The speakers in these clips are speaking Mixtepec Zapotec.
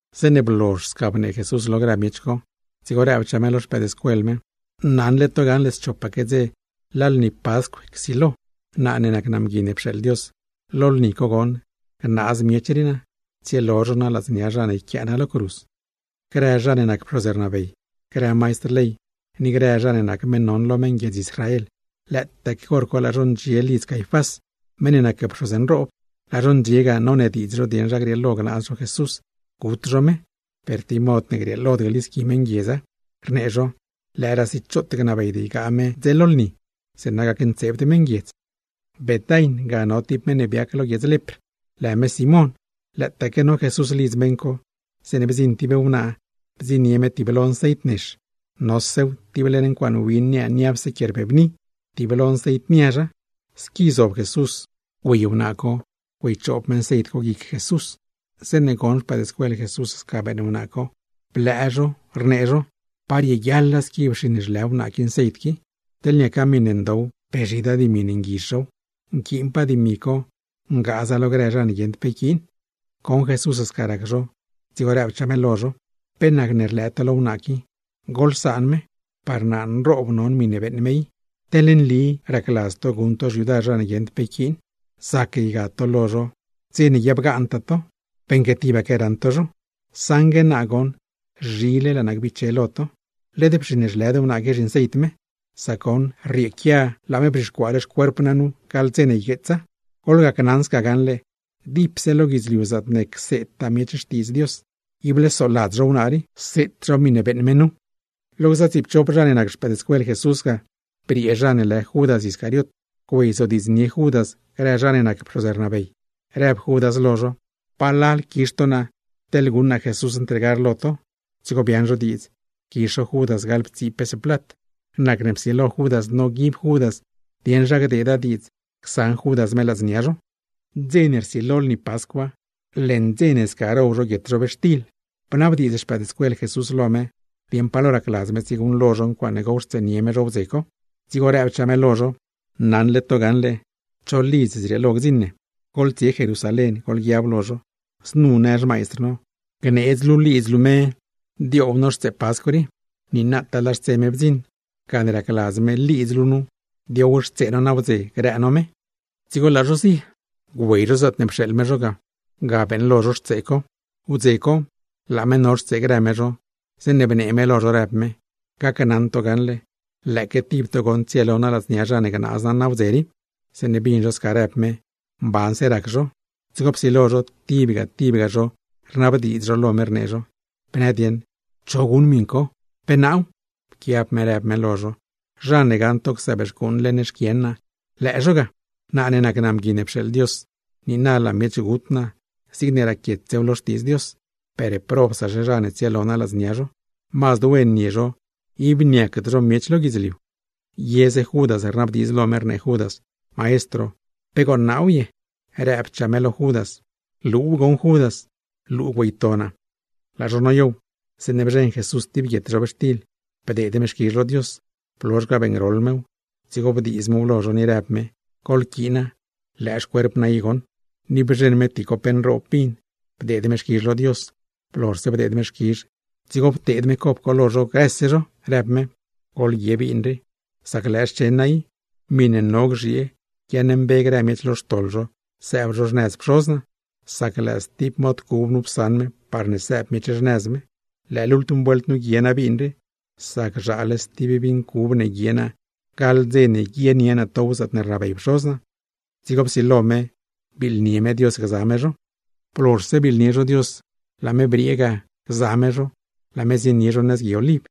Zeeṉe blozh sca bnee Jesús lo grë miech co, dzigo rëbchaa me lo xpëëdscuel me: ―Naṉle to gaṉle schopaque ngbidz, laa lni Pascw csilo. Naa ne nac naa Mgui ne pxeeḻ Dios, lo lni co goṉ gnaaz miech rii naa, tsielo zho naa ladznia zha ne yquiaa naa lo cruz. Grë zha ne nac pxoz ne rnabey, grë maistr ley ni grë zha ne nac meṉ non lo meṉ guiedz Israel, lëëtaque hor co laa zho ndxie lidz Caifás, meṉ ne nac pxoz nroob. Laa zho ndxie ga, nonediidz zho dieṉ zha grieelo gnaaz zho Jesús, gut zho me, per tib mod ne grieelod glisqui meṉ guiedza. Rnee zho: “Lëëraasi choot gnabeyd ygaa me merpaa dze lni, zeeṉa gacntseebd meṉguiedz.” Betain ga no tib meṉ ne biac lo guiedz lepr, lë Simón. Lëëtaaque no Jesús lidz meṉ co, zeeṉe bdziṉ tib wnaa bdziṉnie tiblo nceit nex, nosew tib leṉ ncuaaṉ win niaa niapse quie rbebni, tiblo nceit niazha. Squi zob Jesús lo mezh, güey wnaa co güeychoob me nceit co guic Jesús. Zeeṉe goṉ xpëëdscuel Jesús sca beeṉ wnaa co, blëë zho, rnee zho: ―¡Pa rieguiaḻa squi pxiṉ zhlë wnaa qui nceit qui! Teḻ niaca miṉe ndow, pe zhidaa dimi ne nguizh zhow, nquiinpaa dimi co ngaaza lo grë zha ne guieṉd pe yquiin. Goṉ Jesús sca rac zho, dzigo rëbchaa me lo zho: ―¿Pe nacne rlëë to lo wnaa qui? Goḻsaan me. Par naa nroob non miṉe beeṉ me i. Teḻ nli lëë racladz to guṉ to xyudar zha ne guieṉd pe yquiin, zac ygad to lo zho stib dze, sac tibaque raṉ to zho; saṉgue naa zhile laa naa gbiche lo to. Led pxiṉ zhlëd wnaa rii zhinceit me, sac goṉ rrieequia laa me bzhixcuaale xcuerp naa nu gaḻ dze ne ygueetsa. Gneli naa lo to gaṉle, dipse lo guidzliu zaatne cseedtaa miech Xtiidz Dios, ible soladz zho wnaa rii, seet zho miṉe beeṉ me nu. Lo gza tsiipchop zha ne nac xpëëdscuel Jesús ga, briee zha ne lë Judas Iscariot güeyzodiidznie Judas grë zha ne nac pxoz ne rnabey, rëb Judas lo zho: ―¿Palal quizh to naa teḻne guṉ naa Jesús ntregar lo to? Dzigo biaaṉ zho diidz quizh zho Judas gaḻptsii pes plat. Nacne psilo Judas noguib Judas dieṉ zha gdeeda diidz csaṉ Judas me ladznia zho. Mer dze ne rsilo lni Pascwa, leṉ dze ne sca row zho guietxtil ne riotsd ncobi ga, bnabdiidz xpëëdscuel Jesús lo me dieṉ pa lo racladz me tsieguṉlo zho ncuaaṉe gowxtseenie me zho wdze co. Dzigo rëbchaa me lo zho: ―Naṉle to gaṉle cho lidz zrieelo gdziṉ ne. Goḻtsie Jerusalén goḻguiab lo zho: “Znu në xmaistr no: Gneedz luu lidz luu me dioow no xtsee Pascw rii. Niinataa laa xtse me bdziṉ, gane racladz me lidz luu nu diowxtsee no nawdze grë no me.” Dzigo laa zho zie. Güey zho zaatne pxeeḻ me zho ga, ga beeṉlo zho xtsee co. Wdze co, laa me no xtsee grë me zho, zeeṉe bnee me lo zho rëb me: ―Gacnaṉ to gaṉle, lëëque tib to goṉ tsielo naa ladznia zha ne gnaaz naa nawdze rii. Zeeṉe bin zho sca rëb me, mbanse rac zho, dzigo psilo zho tibga tibga zho rnabdiidz lo me, rnee zho: ―Bnë dieṉ, ¿cho guṉ miṉ co? ¿Pe naaw? Pquiab me rëb me lo zho: ―Zha ne gaṉ to csëëb xcuuṉ leṉ xquien naa, lëë zho ga. Naa ne nac naa Mgui ne pxeeḻ Dios, niina laa miech gut naa zigne raquietsew lo Xtiidz Dios; per, ¡probsaxe zha ne tsielo naa ladznia zho! ¡Mazd wen nie zho, ib niacd zho miech lo guidzliu! Yeze Judas rnabdiidz lo me rnee Judas: ―Maestro, ¿pe gooṉ naaw ye? Rëbchaa me lo Judas: ―Luuw goṉ Judas, luu güeyto naa. Laa zho noyow, zeeṉe bzheṉ Jesús tib guietxtil, bdeed me xquizh lo Dios, blozh ga beeṉgroḻ mew, dzigo bdiiz mew lo zho, ni rëb me: ―Goḻquiina, lëë xcuerp naa i goṉ. Ni bzheṉ me tib cop nroob vin, bdeed me xquizh lo Dios, blozhse bdeed me xquizh, dzigo pteed me cop co lo zho grëse zho, rëb me: ―Goḻguie vin qui, sac lëë xchen naa i, miṉe no gzhiee par guiaaṉmbe grë miech lo xtoḻ zho sëëb zho xnëz Pxoz naa, sac lëë stib mod cub nu psaṉ me parne sëëb miech xnëz me. Lëë lultm vuelt nu guie naa vin rii, sac zhaale stib vin cub ne guie naa gaḻ dze ne guienie naa tow zaatne rnabey Pxoz naa. Dzigo psilo me biiḻnie me Dios gza me zho. Blozhse biiḻnie zho Dios, laa me briee ga gza me zho, laa me zienie zho nëz Gui Oliv.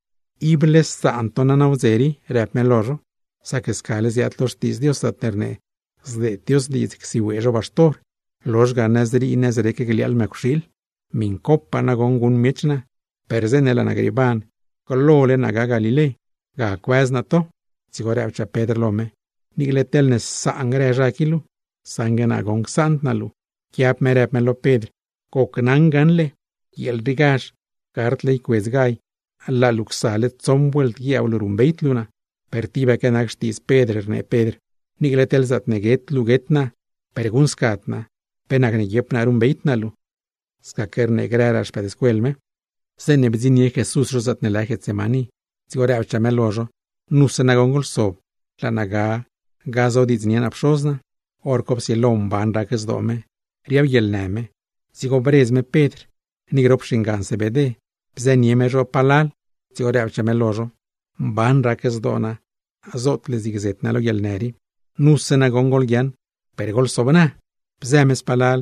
―Ible saan to naa nawdze rii ―rëb me lo zho―, sac scale ziaad lo Xtiidz Dios zaatne rnee: “Zdeed Dios diidz csiwee zho baxtor, lozh ga nëzrii nëzrec gliaaḻ mëcwxiil.” Miṉcopaa nagoṉ guṉ miech naa, per zeeṉe laa naa grieeban glole naa ga Galilé, ga cuëz naa to. Dzigo rëbchaa Pedr lo me: ―Niicle teḻne saan grë zha qui luu, saṉgue naa goṉ csaand naa luu. Pquiab me rëb me lo Pedr: ―Gneli naa lo luu gaṉle, guieel riigazh, gardle ycuedz gall, laa luu csale tsoṉ vuelt guiab luu ruṉbeyd luu naa. Per tibaque nac xtiidz Pedr, rnee Pedr lo me: ―Niicle teḻ zaatne guet luu guet naa, per guṉscad naa. ¿Pe nacne guiep naa ruṉbeyd naa luu? Scaque rnee grëraa xpëëdscuel me. Zeeṉe bdziṉnie Jesús zho zaatne lë Getsemaní, dzigo rëbchaa me lo zho: ―Nuse nagoṉ goḻsob, laa naa ga gazodiidznie naa Pxoz naa. Horco psilo mban rac zdoo me, riabguieḻnë me, dzigo bredz me Pedr, ni grop xingan Zebedé, bzënie me zho palal dzigo rëbchaa me lo zho: ―Mban rac zdoo naa, zootle zig zet naa lo guieḻnë rii. Nuse nagoṉ goḻguiaaṉ, per goḻsobna. Bzë me spalal,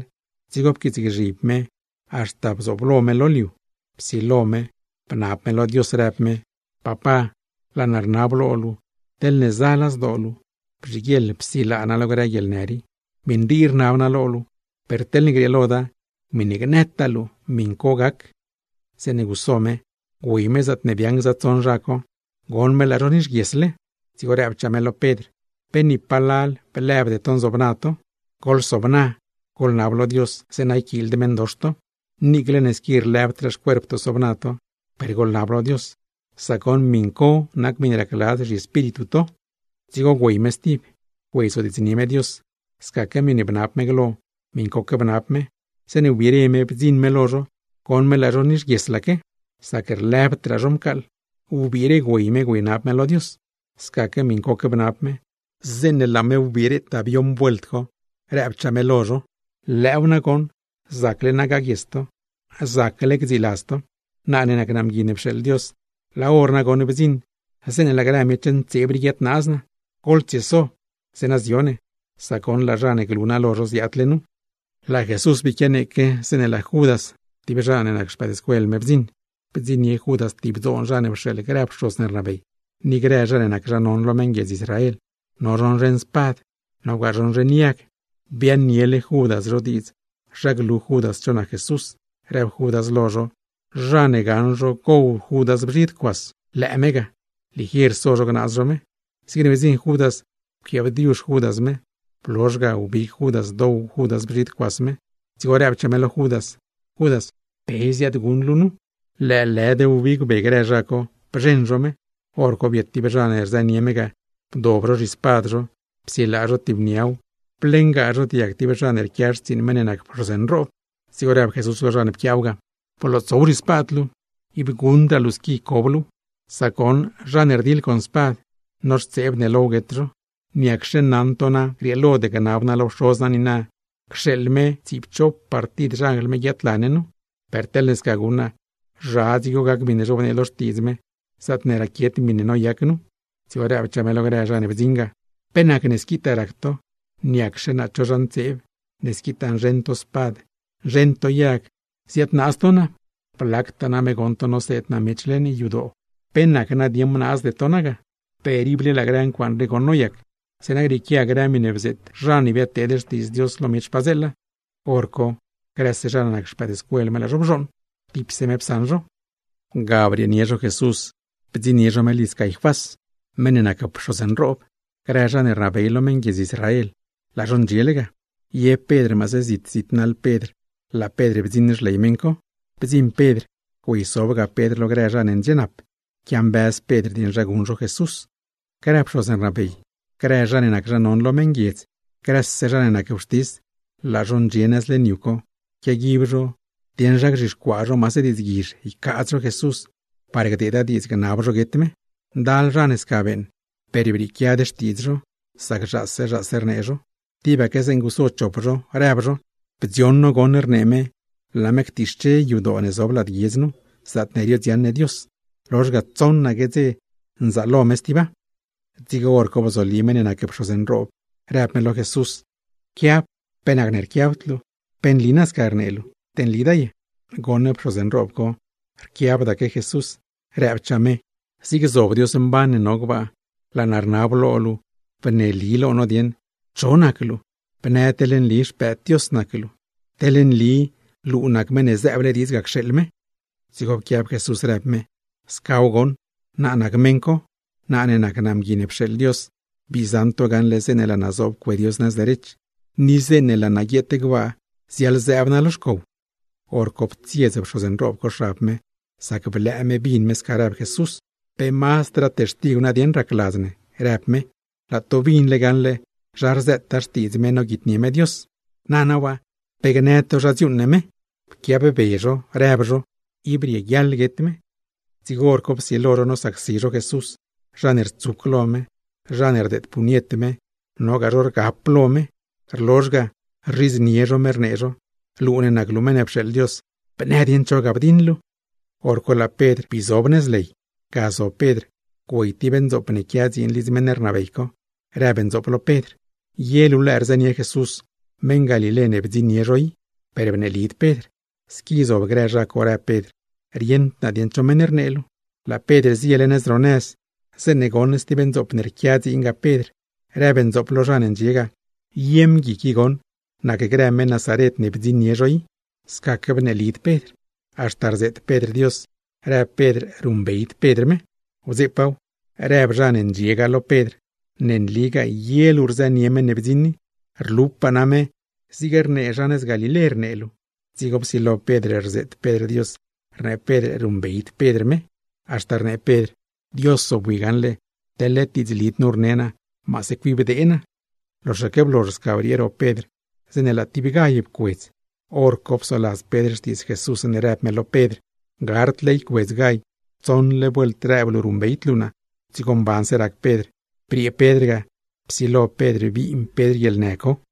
dzigo pquiitsgzhib me haxta bdziṉ lo me lo liu; psilo me bnab me lo Dios, rëb me: ―Papá, laa naa rnab lo luu, teḻne zala zdoo luu, bzhiguieḻ psilaa naa lo grë guieḻnë rii. Miṉ rii rnab naa lo luu, per teḻne grieeloda, miṉe gnëtaa luu, miṉ co gac. Zeeṉe guso me, güey me zaatne biaaṉ gza tsoṉ zha co, goṉ me laa zho nixguiesle; dzigo rëbchaa me lo Pedr: ―¿Pe ni palal blëbde to nzobna to? Goḻsobna, goḻnab lo Dios zeeṉa yquiild meṉdox to. Niicle ne squi lëbdraa xcuerp to sobna to, per goḻnab lo Dios, sac goṉ miṉ co nac miṉe racladz zhiespíritu to. Dzigo güey me stib, güeyzodiidznie me Dios; scaque miṉe bnab me glo miṉcoque bnab me. Zeeṉe wbiire me bdziṉ me lo zho, goṉ me laa zho nixguieslaque, sac lëbdraa zho mcaaḻ. Wbiire güey me güeynab me lo Dios, scaque miṉcoque bnab me. Zeeṉe laa me wbiretaa bioṉ vuelt co, rëbchaa me lo zho: ―Lëëw nagoṉ, zacle na gaguies to, zacle gdziiladz to. Naa ne nac naa Mgui ne pxeeḻ Dios, laa hor nagoṉ bdziṉ zeeṉe laa grë miech ntseeb rii guiadnaaz naa. Goḻtsieso, zeeṉa zio ne; sac goṉ laa zha ne glu naa lo zho ziaadle nu. Laa Jesús bii quianeeque, zeeṉe laa Judas (tib zha ne nac xpëëdscuel me) bdziṉ, bdziṉnie Judas tib dzoon zha ne pxeeḻ grë pxoz ne rnabey, ni grë zha ne nac zha non lo meṉ guiedz Israel. No zho nzheṉ spad, nogaa zho nzheṉ yag. Biaaṉniele Judas zho diidz zha glu Judas cho nac Jesús, rëb Judas lo zho zha ne gaṉ zho gow Judas bzhid cuas, lëë me ga, ligier so zho gnaaz zho me. Zigne bdziṉ Judas pquiaabdiuzh Judas me, blozhse ga wbig Judas dow Judas bzhid cuas me. Dzigo rëbchaa me lo Judas: ―Judas, ¿pe ziaadguṉ luu nu? Lëëlëd wbig be grë zha co, bzheṉ zho me. Horco biet tib zha ne rzënie me ga, bdob zho zhispad zho psilaa zho tib niaw, bliengaa zho diag tib zha ne rquia xtsiiṉ meṉ ne nac pxoz nroob. Dzigo rëb Jesús lo zha ne pquiaaw ga: ―Blootsow zhispad luu, ib guṉdraa luu squi cob luuw. Sac goṉ zha ne rdiḻ con spad, noxtseeb ne low guet zho. ¿Niacxe naṉ to na grieelod gnab naa lo Pxoz naa niina cxeeḻ me tsiipchop partid xanjl me guiaadla ne nu? Per teḻne sca guṉ naa, ¿zha dzigo gac miṉe zhobnee lo Xtiidz Dios, zaatne raquiet miṉe noyac nu? Dzigo rëbchaa me lo grë zha ne bdziṉ ga: ―¿Pe nacne squitaa rac to? ¿Niacxe naa cho zha ntseeb, ne squitaa nzheṉ to spad, nzheṉ to yag ziadnaaz to naa? Blactaa name goṉ to noseed naa miech leṉ yadoo, ¿pe nacne bnaazde to naa ga? Per ible laa grë ncuaaṉ rii goṉ noyac, zeeṉa grieequia grë miṉe bzeet grë zha ne biadteed xtiidz Dios lo miech padzeela. Horco grëse zha ne nac xpëëdscuel me laa zho bzhooṉ, tipse me psaṉ zho ga. Ga brieenie zho Jesús bdziṉnie zho me lidz Caifás, meṉ ne nac pxoz nroob. Grë zha ne rnabey lo meṉguiedz Israel, laa zho ndxiele ga. Ye Pedr maase zit zit naḻ Pedr laa Pedr bdziṉ xley meṉ co. Bdziṉ Pedr güeysobga Pedr lo grë zha ne ndxienap, quiambëz Pedr dieṉ zha guṉ zho Jesús. Grë pxoz ne rnabey, grë zha ne nac zha non lo meṉguiedz, grëse zha ne nac wxtis, laa zho ndxie nëz leṉ yu co, quiaguib zho zha ne gzhixcuaa maase diidzguizh ycaadz zho Jesús, parne gdeeda diidz gnab zho guet me. Ndal zha ne sca beeṉ, per brieequiad xtiidz zho, sac zhaase zhaase rnee zho. Tibaque zeeṉe guso chop zho, rëb zho: ―Bdzioṉ no goṉ rnee me laa me ctixche yadoo ne zob lad guiedz nu, zaatne riodziaṉ ne Dios, lozh ga tsoṉaque ngbidz gzaalo me stiba. Dzigo hor co bzoli meṉ ne nac pxoz nroob, rëb me lo Jesús: ―¿Pe nacne rquiabd luu? ¿Pe nli sca rnee luu, te nlida ye? Goṉ pxoz nroob co rquiabdaque Jesús, rëbchaa me: ―Zig zob Dios mban ne no gbaa, laa naa rnab lo luu bneeli lo no dieṉ cho nac luu. Bnë teḻ nli Xpëëd Dios nac luu, Meṉ ne zëëble diidz ga cxeeḻ me. Dzigo pquiab Jesús rëb me: ―Scaw goṉ, naa nac meṉ co. Naa ne nac naa Mgui ne pxeeḻ Dios, bii zaṉ to gaṉle zeeṉe laa naa zoob cue Dios nëz derech, ni zeeṉe laa naa guieet gbaa ziaḻzëëb naa lo xcow. Horco ptsiez pxoz nroob co xab me, sac blëë me bin me sca rëb Jesús. ―¿Pe mazdraa textigw ne racladz ne? ―rëb me―. Laa to binle gaṉle zha rzëtaa xtiidz me noguitnie me Dios. Nana waa, ¿pe gnë to zha dziuuṉ ne me? Pquiab be zho rëb zho: ―¡Ib rieguiaḻ guet me! Dzigo hor co psilo zho nosacsi zho me. Zha ne rtsuc lo me, zha ne rdeed puñet me, nogaa zho rgap lo me, rlozh ga rzhidznie zho me rnee zho: ―Luu ne nac luu meṉ ne pxeeḻ Dios, ¿bnë dieṉ cho ga bdiṉ luu? Horco laa Pedr bii zob nëz ley. Ga zob Pedr, güey tib ndzoop ne quia dziin lidz meṉ rnabey co; rëb ndzoop lo Pedr: ―¿Ye luu lëë rzënie Jesús, meṉ Galilé ne bdziṉnie zho i? Per bneelid Pedr. Squi zob grë zha co, rëb Pedr: ―Rieṉd naa dieṉ cho meṉ rnee luu. Laa Pedr ziele nëz ro puert ne quia ro nëz, zeeṉe goṉ stib ndzoop ne rquia dziin ga Pedr, rëb ndzoop lo zha ne ndxie ga: ―Ye mgui qui goṉ nacgrë meṉ Nazaret ne bdziṉnie zho i. Scaque bneelid Pedr, haxta rzeet Pedr Dios rëb Pedr ruṉbeyd Pedr me. Wdzeepaaw, rëb zha ne ndxie ga lo Pedr: ―Ne nligaa ye luu rzënie meṉ ne bdziṉ i. ¡Rlupaa name zig rnee zha nëz Galilé rnee luu! Dzigo psilo Pedr rzeet Pedr Dios rnee Pedr ruṉbeyd Pedr Jesús, haxta rnee Pedr: ―Dios zobwi gaṉle, teḻne led diidzlid nu rne naa, maase cuibdee naa. Loxaque blozh sca briee ro Pedr zeeṉe laa tib gall pcuedz. Horco psoladz Pedr xtiidz Jesús zeeṉe rëb me lo Pedr: “Gardle ycuedz gall, tsoṉle vuelt rëb luu ruṉbeyd luu naa.” Dzigo mbanse rac Pedr. Briee Pedr ga, psilo Pedr biin Pedr guieḻnë co.